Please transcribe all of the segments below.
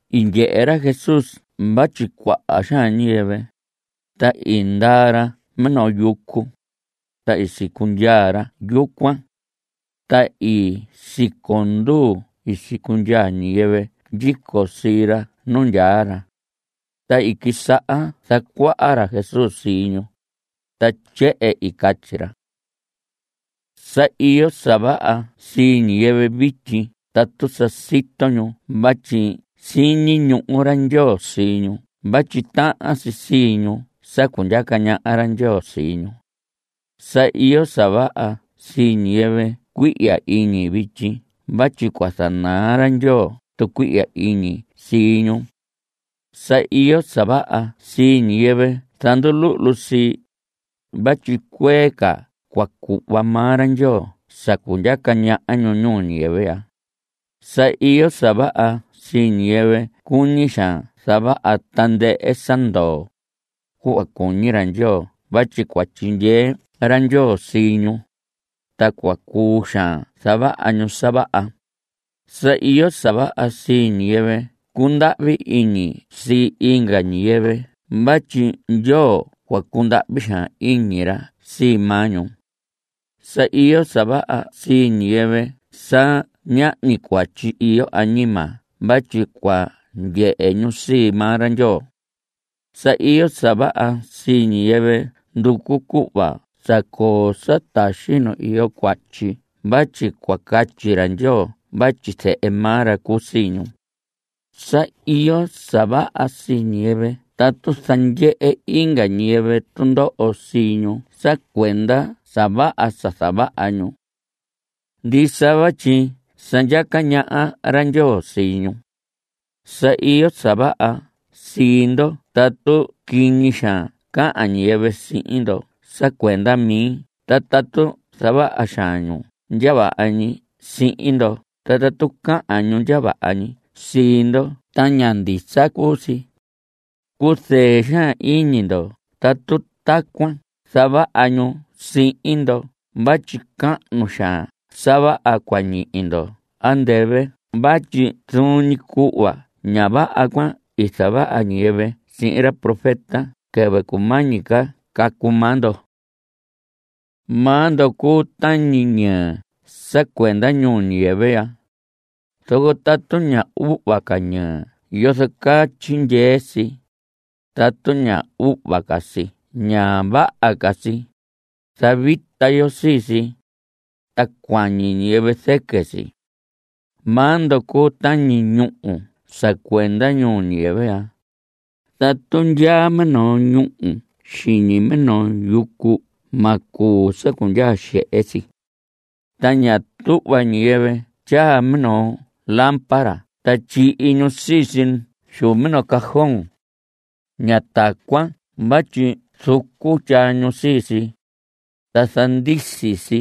I ndyehe ra Jesús vatyi cuaha xaan ñiyɨvɨ, ta i ndaa ra minoo yucu, ta i sicundyaa ra yucuan. Ta i siconduu i sicundyaa ñiyɨvɨ ndyico sii ra nu ndyaa ra. Ta i quisaha zacuaha ra Jesús sii ñu, ta tyehen catyi ra: Sa iyo sa vaha sii ñiyɨvɨ vityi tatu sa sito ñu vatyi siñi ñuhu ra Ndyoo sii ñu vatyi tahan si sii ñu sa cundyaca ñaha ra Ndyoo sii ñu. Sa iyo sa vaha sii ñiyɨvɨ cuihya iñi vityi vatyi cua zanaa ra Ndyoo tucuihya iñi sii ñu. Sa iyo sa vaha sii ñiyɨvɨ zanduluhlu sii, vatyi cuee ca cua cuhva maa ra Ndyoo sa cundyaca ñaha ñu ñuu ñiyɨvɨ ya. Sa iyo sa vaha sii ñiyɨvɨ cuñi xaan zavaha tandɨhɨ sa ndoo, cuhva cuñi ra Ndyoo vatyi cua tyindyee ra Ndyoo sii ñu, ta cua cuu xaan zavaha ñu sa vaha. Sa iyo sa vaha sii ñiyɨvɨ cundahvi iñi sii inga ñiyɨvɨ vatyi Ndyoo cua cundahvi xaan iñi ra sii maa ñu. Sa iyo sa vaha sii ñiyɨvɨ sa ñahñi cuatyi iyo añima vatyi cua ndyehe ñu sii maa ra Ndyoo. Sa iyo sa vaha sii ñiyɨvɨ nducu cuhva zacoo sa taxi nu iyo cuatyi vatyi cua catyi ra Ndyoo vatyi zehe maa ra cuu sii ñu. Sa iyo sa vaha sii ñiyɨvɨ tatu zandyehe inga ñiyɨvɨ tundoho sii ñu sa cuenda sa vaha sa zavaha ñu. Ndisa vatyi sa ndyaca ñaha ra Ndyoo sii ñu. Sa iyo sa vaha sii ndo tatu quiñi xaan cahan ñiyɨvɨ sihin ndo sa cuenda mi ta tatu zavaha xaan ñu sa ndya vaha ñi sihin ndo ta tatu cahan ñu ndya vaha ñi sii ndo ta ña ndisa cuu si. Cuzɨɨ xaan iñi ndo tatu tacuan zavaha ñu sihin ndo vatyi cahnu xaan sa vaha cua ñihi ndo andɨvɨ vatyi zuun ñi cuhva ña vaha cuan i zavaha ñiyɨvɨ sihin ra profeta quɨvɨ cumañi ca cacu maa ndo. Maa ndo cuu tañi ñɨɨ sa cuenda ñuu ñiyɨvɨ ya. Zoco tatu ña uhva ca ñɨɨ, ¿yozo caa tyindyee si? Tatu ña uhva ca si ña vaha ca si. Zavita yo sii si, ta cuañi ñiyɨvɨ zɨquɨ si. Maa ndo cuu tañi ñúhu sa cuenda ñuu ñiyɨvɨ ya. Tatu ndyaa minoo ñuu xiñi minoo yucu ma cuu sa cundyaa xehe si. Ta ña tuhva ñiyɨvɨ tyaa minoo lámpara ta tyihi ñu sii si xu minoo cajón. Ña tacuan vatyi zucu tyaa ñu sii si, ta zandisi si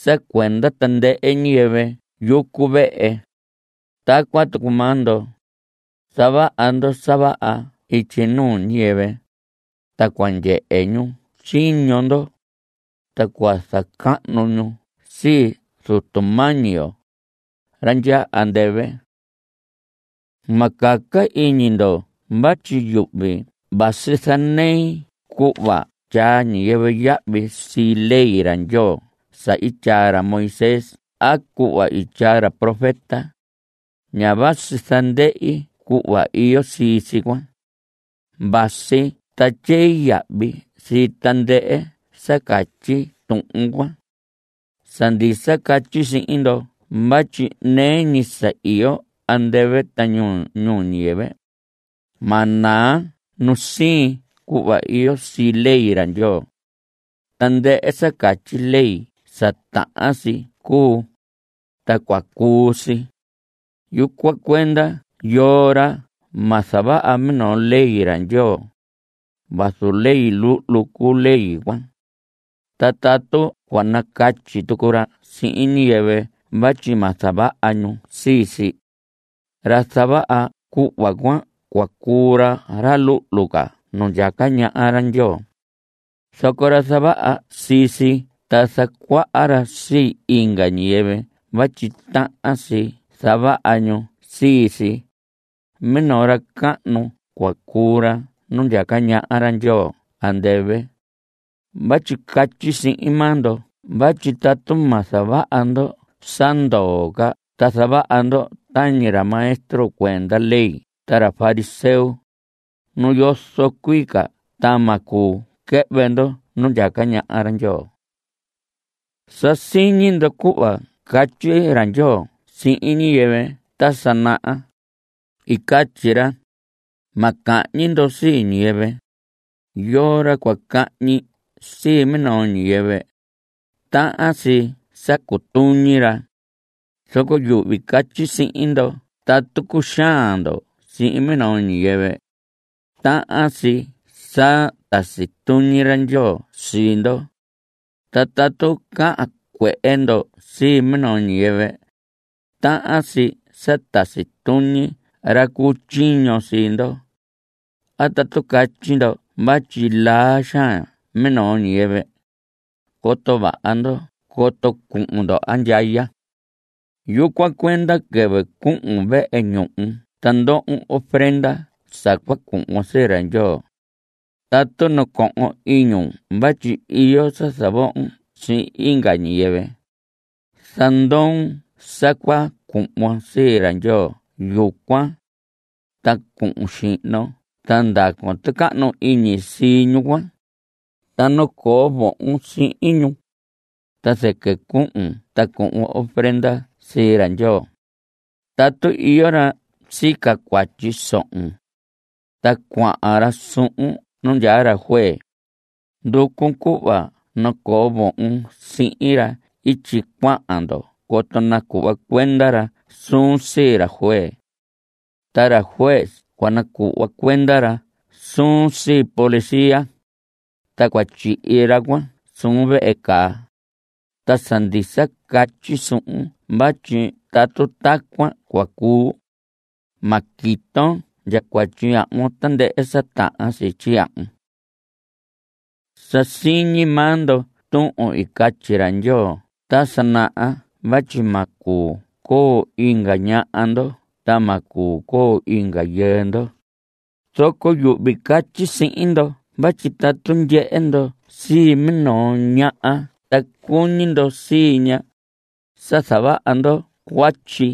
sa cuenda tandɨhɨ ñiyɨvɨ yucu vehe. Tacuan tucu maa ndo, zavaha ndo sa vaha ityi nuu ñiyɨvɨ, ta cua ndyehe ñu tyiño ndo, ta cua zacahnu ñu sii Zutu mañi yo, ra ndyaa andɨvɨ. Ma caca iñi ndo vatyi yuhvi vasi zanei cuhva tyaa ñiyɨvɨ yahvi sii ley ra Ndyoo sa i tyaa ra Moisés a cuhva i tyaa ra profeta. Ña vasi zandɨhi cuhva iyo sii si cuan. Vasi ta tyei yahvi sii tandɨhɨ sa catyi tuhun cuan. Sa ndisa catyi sihin ndo vatyi nɨɨ ñi sa iyo andɨvɨ ta ñuhu ñuu ñiyɨvɨ, ma naa nu siin cuhva iyo sii ley ra Ndyoo. Tandɨhɨ sa catyi ley sa tahan si cuu, ta cua cuu si. Yucuan cuenda yoo ra ma zavaha minoo ley ra Ndyoo, vazu ley luhlu cuu ley cuan, ta tatu cua nacatyi tucu ra sihin ñiyɨvɨ vatyi ma zavaha ñu sii si, ra zavaha cuhva cuan cua cuu ra ra luhlu ca nu ndyaca ñaha ra Ndyoo. Zoco ra zavaha sii si ta zacuaha ra sii inga ñiyɨvɨ vatyi tahan si zavaha ñu sii si, minoo ra cahnu cua cuu ra nu ndyaca ñaha ra Ndyoo andɨvɨ. Vatyi catyi sihin maa ndo vatyi tatu ma zavaha ndo sa ndoo ca ta zavaha ndo tañi ra maestro cuenda ley ta ra fariseo, nu yozo cuii ca ta ma cuu quɨhvɨ ndo nu ndyaca ñaha ra Ndyoo. Sa siñi ndo cuhva i catyi ra Ndyoo sihin ñiyɨvɨ ta sa naha. I catyi ra: “Ma cahñi ndo sii ñiyɨvɨ. Yoo ra cua cahñi sii minoo ñiyɨvɨ, tahan si sa cutuñi ra.” Zoco yuhvi catyi sihin ndo tatu cuxaan ndo sihin minoo ñiyɨvɨ, tahan si sa tasi tuñi ra Ndyoo sii ndo. Ta tatu cahan cuehe ndo sii minoo ñiyɨvɨ, tahan si sa tasi tuñi ra cu tyiño sii ndo. A tatu catyi ndo vatyi laa xaan minoo ñiyɨvɨ, coto vaha ndo coto cuhun ndo andyaya. Yucuan cuenda quɨvɨ cuhun vehe ñuhu ta ndohon ofrenda sa cua cuhvon sii ra Ndyoo, tatu nacohon iñun vatyi iyo sa zavohon sii inga ñiyɨvɨ zandoon sa cua cuhvon sii ra Ndyoo yucuan. Ta cuhun xihnon ta ndacon tucahnu iñi sii ñu cuan, ta nacoo vohon sihin ñu, ta zɨquɨ cuhun ta cuhvon ofrendon sii ra Ndyoo. Tatu iyo ra sica cuatyi sohon, ta cuahan ra suhun nu ndyaa juez, nducun cuhva nacoo vohon sihin ra ityi cuahan ndo coto nacuhva cuenda ra suun sii ra juez. Ta ra juez cua nacuhva cuenda suun sii policía, ta cua tyihi ra cuan suun vehe caa. Ta sa ndisa catyi suhun vatyi tatu tacuan cua cuu, ma quiton ndya tyiyahvun tandɨhɨ sa tahan si tyiyahvun. Sa siñi maa ndo tuhun i catyi ra Ndyoo ta sa naha vatyi ma cuu coo inga ñaha ndo ta ma cuu coo inga yɨɨ ndo. Zoco yuhvi catyi sihin ndo vatyi tatu ndyehe ndo sii minoo ñaha ta cuñi ndo sii ña, sa zavaha ndo cuatyi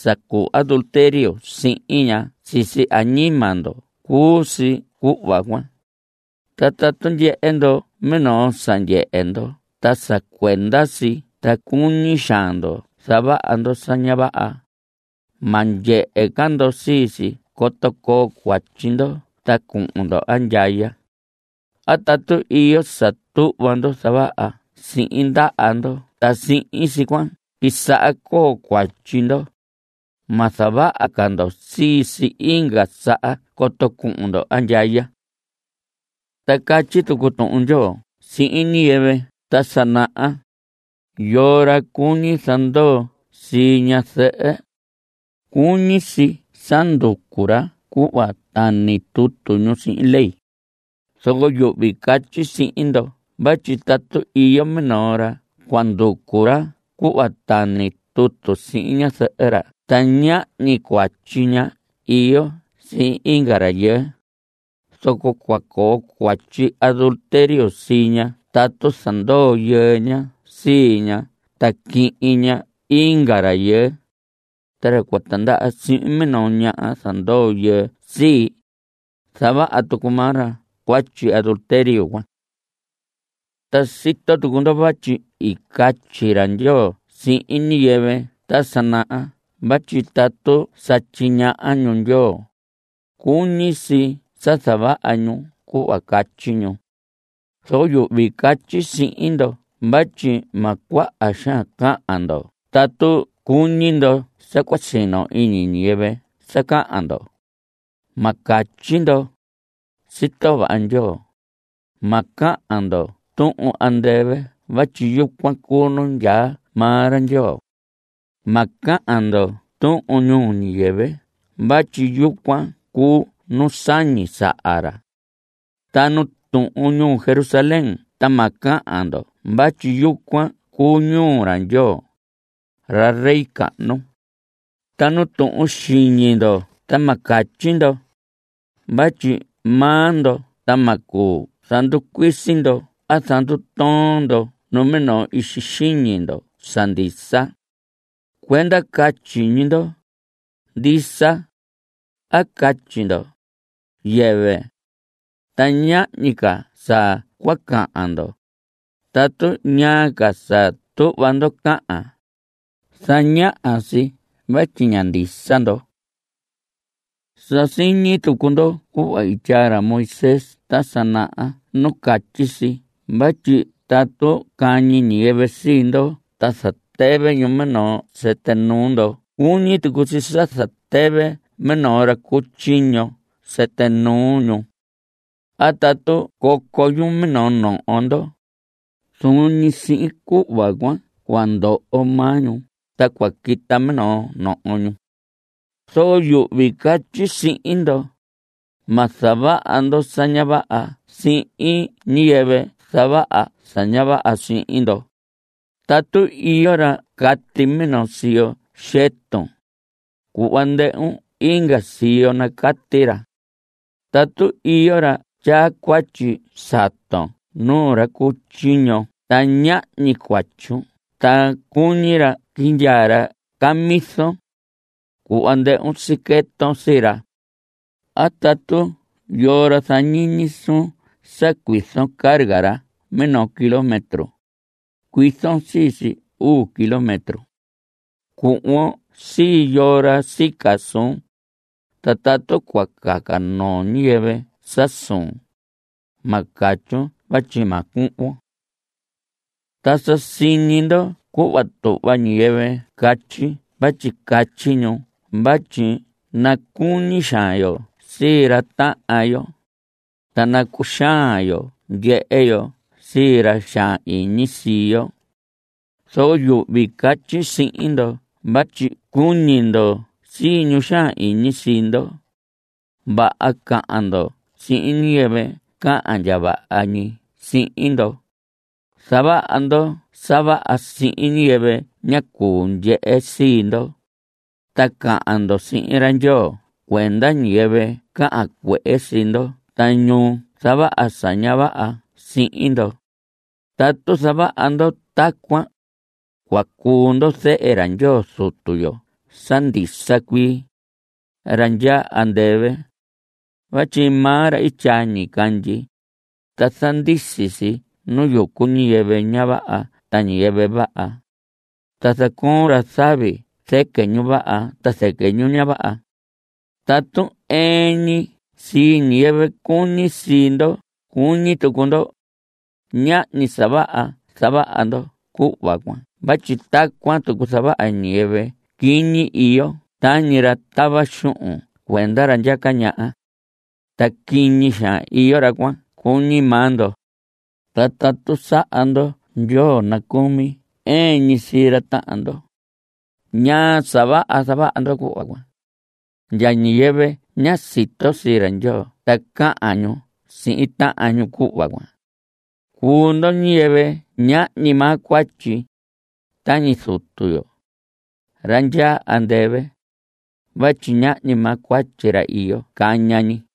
sa cuu adulterio sihin ña sisi añima ndo cuu si cuhva cuan. Ta tatu ndyehe ndo minoo sa ndyehe ndo ta sa cuenda si ta cuñi xaan ndo zavaha ndo sa ña vaha, ma ndyehe ca ndo sii si coto coo cuatyi ndo ta cuhun ndo andyaya. A tatu iyo sa tuhva ndo zavaha sihin ndaha ndo ta sihin si cuan quisaha coo cuatyi ndo, ma zavaha ca ndo sii si inga saha coto cuhun ndo andyaya. Ta catyi tucu Tuhun Ndyoo sihin ñiyɨvɨ ta sa naha: “Yoo ra cuñi zandoo sii ñazɨhɨ, cuñi si sa nducu ra cuhva tani tutu ñu sihin ley.” Zoco yuhvi catyi sihin ndo vatyi tatu iyo minoo ra cua nducu ra cuhva tani tutu ra sihin ñazɨhɨ ra ta ñahñi cuatyi ña iyo sihin inga rayɨɨ, zoco cua coo cuatyi adulterio sii ña tatu zandoo yɨɨ ña sii ña ta quihin ña sii inga rayɨɨ. Ta ra cua tindaha sihin minoo ñaha zandoo yɨɨ sii, zavaha tucu maa ra cuatyi adulterio cuan. Ta sito tucu ndo vatyi i catyi ra Ndyoo sihin ñiyɨvɨ ta sa naha vatyi tatu sa tyiñaha ñu Ndyoo, cuñi si sa zavaha ñu cuhva catyi ñu. Zoco yuhvi catyi sihin ndo vatyi ma cuaha xaan cahan ndo tatu cuñi ndo sa cua sino iñi ñiyɨvɨ sa cahan ndo. Ma catyi ndo: “Sito vaha Ndyoo.” Ma cahan ndo tuhun andɨvɨ vatyi yucuan cuu nu ndyaa maa ra Ndyoo. Ma cahan ndo tuhun ñuu ñiyɨvɨ vatyi yucuan cuu nu sañi saha ra. Ta nu tuhun ñuu Jerusalén ta ma cahan ndo vatyi yucuan cuu ñuu ra Ndyoo, ra rey cahnu. Ta nu tuhun xiñi ndo ta ma catyi ndo, vatyi maa ndo ta ma cuu zanducuisi ndo a zandutoon ndo numinoo ixi xiñi ndo sa ndisa. Cuenda catyi ñi ndo: “Ndisa.” A catyi ndo: “Yɨvɨ.” Ta ñahñi ca sa cua cahan ndo. Tatu ñaa ca sa tuhva ndo cahan, zañaha si vatyi ña ndisa ndo. Sa siñi tucu ndo cuhva i tyaa ra Moisés ta sa naha nu catyi si vatyi tatu cañi ñiyɨvɨ sii ndo ta zatɨvɨ ñu minoo sɨtɨ nuu ndo cuñi tucu si sa zatɨvɨ minoo ra cu tyiño sɨtɨ nuu ñu. A tatu coco ñu minoo noho ndo, zuun ñi sihin cuhva cuan cua ndoho maa ñu, ta cua quita minoo noho ñu. Zoco yuhvi catyi sihin ndo: Ma zavaha ndo sa ña vaha sihin ñiyɨvɨ zavaha sa ña vaha sihin ndo. Tatu iyo ra cati minoo siyo xɨtun, cuhva ndɨhun inga siyo nacati ra. A tatu iyo ra tyaa cuatyi saton nuu ra cu tyiño ta ñahñi cuatyun ta cuñi ra quindyaa ra camison, cuhva ndɨhun siqueton sii ra. A tatu yoo ra zañiñi suun sa cuizon carga ra minoo kilómetro, cuizon sii si uu kilómetro. Cuhvon sii yoo ra sica suun, ta tatu cua caca noo ñiyɨvɨ sa suun, ma catyun vatyi ma cuhvon. Ta sa siñi ndo cuhva tuhva ñiyɨvɨ catyi vatyi catyi ñu vatyi nacuñi xaan yo sii ra tahan yo, ta nacuxaan xaan yo ndyehe yo sii ra xaan iñi sii yo. Zoco yuhvi catyi sihin ndo vatyi cuñi ndo sii ñu xaan iñi sii ndo. Vaha cahan ndo sihin ñiyɨvɨ cahan ndya vaha ñi sihin ndo. Zavaha ndo sa vaha sihin ñiyɨvɨ ña cuu ndyehe sii ndo. Ta cahan ndo sihin ra Ndyoo cuenda ñiyɨvɨ cahan cuehe sii ndo ta ñu zavaha sa ña vaha sihin ndo. Tatu zavaha ndo tacuan, cua cuu ndo zehe ra Ndyoo Zutu yo sa ndisa cuii, ra ndya andɨvɨ, vatyi maa ra i tyaa ñicandyi, ta zandisi si nu yucu ñiyɨvɨ ña vaha ta ñiyɨvɨ vaha. Ta zacoon ra zavi zɨquɨ ñu vaha ta zɨquɨ ñu ña vaha. Tatu ɨɨn ñi sii ñiyɨvɨ cuñi sii ndo cuñi tucu ndo, ñahñi sa vaha zavaha ndo cuhva cuan vatyi tacuan tucu zavaha ñiyɨvɨ quiñi iyo tañi ra tava xuhun cuenda ra ndyaca ñaha. (Ta quiñi xaan iyo ra cuan cuñi maa ndo.) Ta tatu saha ndo ndyoo nacucumi ɨɨn ñi sii ra tahan ndo, ¿ñaa sa vaha zavaha ndo cuhva cuan? Ndya ñiyɨvɨ ña sito sii ra Ndyoo ta cahan ñu sihin tahan ñu cuhva cuan. Cuu ndo ñiyɨvɨ ñahñi maa cuatyi. Tañi Zutu yo, ra ndyaa andɨvɨ, vatyi ñahñi maa cuatyi ra iyo caña ñi.